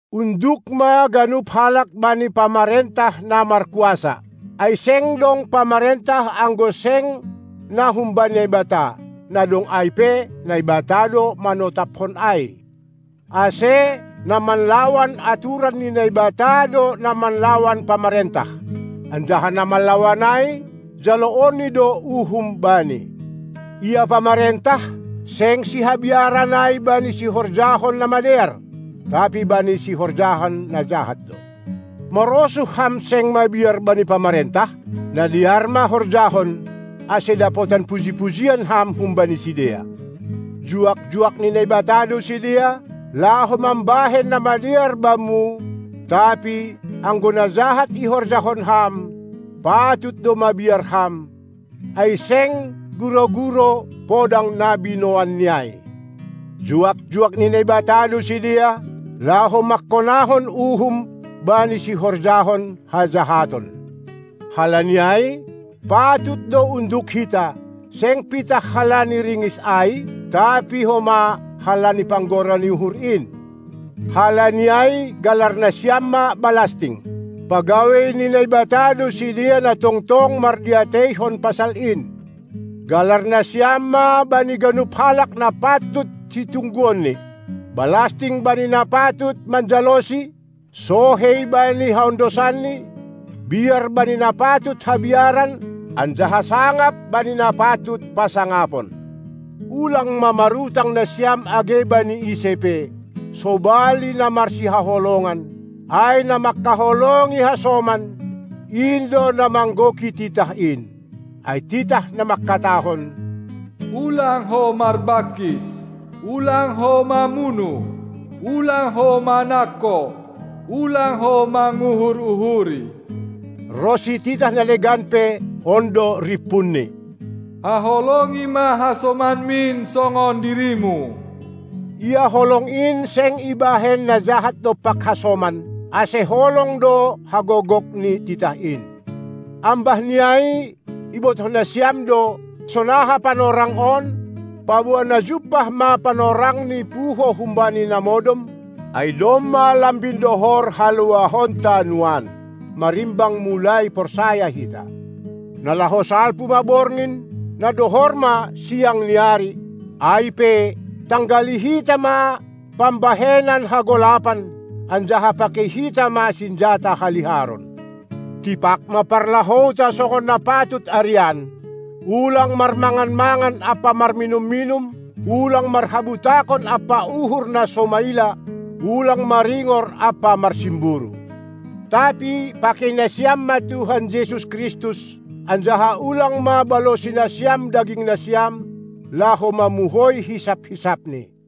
Unduk ma ganup halak bani pamarentah na markuasa. Ai seng dong pamarentah anggo seng na humbani Naibata, na dong ai pe Naibata do manotapkon ai. Ase, na manlawan aturan ni Naibata do na manlawan pamarentah. Anjaha na manlawan ai, jaloonni do uhum bani. Ia pamarentah seng sihabiaran ai bani sihorjahon na madear, tapi bani sihorjahon na jahat do. Marosuh ham seng mabiar bani pamarentah? Na dear ma horjahon, ase dapotan puji-pujian ham humbani sidea. Juak-juak ni Naibata do sidea, laho mambahen na madear bamu. tapi, anggo na jahat ihorjahon ham, patut do mabiar ham, ai seng gurou-gurou podang na binoanni ai. Juak-juak ni Naibata do sidea, laho mangkonahon uhum bani sihorjahon hajahaton. Halani ai patut do unduk hita, seng pitah halani ringis ai, tapi homa halani panggora ni uhur in. Halani ai galar nasiam ma balasting. Pagawei ni Naibata do sidea na tongtong mardiateihon pasal in. Galar nasiam ma bani ganup halak na patut situngguonni. Balasting bani na patut manjalosi, sohei bani haondosanni, biar bani na patut habiaran anjaha sangap bani na patut pasangapon. Ulang ma marutang nasiam age bani ise pe, sobali na marsihaholongan, ai na mangkaholongi hasoman, in do na manggoki titah in. Ai titah na mangkatahon: "Ulang ho marbangkis, ulang ho mamunuh, ulang ho manangko, ulang ho manguhur-uhuri," ronsi titah na legan pe, on do rimpunni: Haholongi ma hasomanmin songon dirimu! Ia holong in seng ibahen na jahat dompak hasoman; ase holong do hagogok ni titah in. Ambah ni ai, ibotoh nasiam do, sonaha panorang on, paboa na jumpah ma panorangni puho humbani na modom, ai domma lambin dohor haluahonta nuan, marimbang mulai porsaya hita. Na laho salpu ma borngin, na dohor ma siang ni ari. Ai pe, tanggali hita ma pambahenan hagolapan, anjaha pakei hita ma sinjata haliharon! Tipak ma parlahouta songon na patut arian, ulang marmangan-mangan ampa marminum-minum, ulang marhabutakon ampa uhur na so maila, ulang maringor ampa marsimburu! Tapi pakei nasiam ma Tuhan Jesus Kristus, anjaha ulang ma balosi nasiam dagingnasiam, laho mamuhoi hisap-hisapni.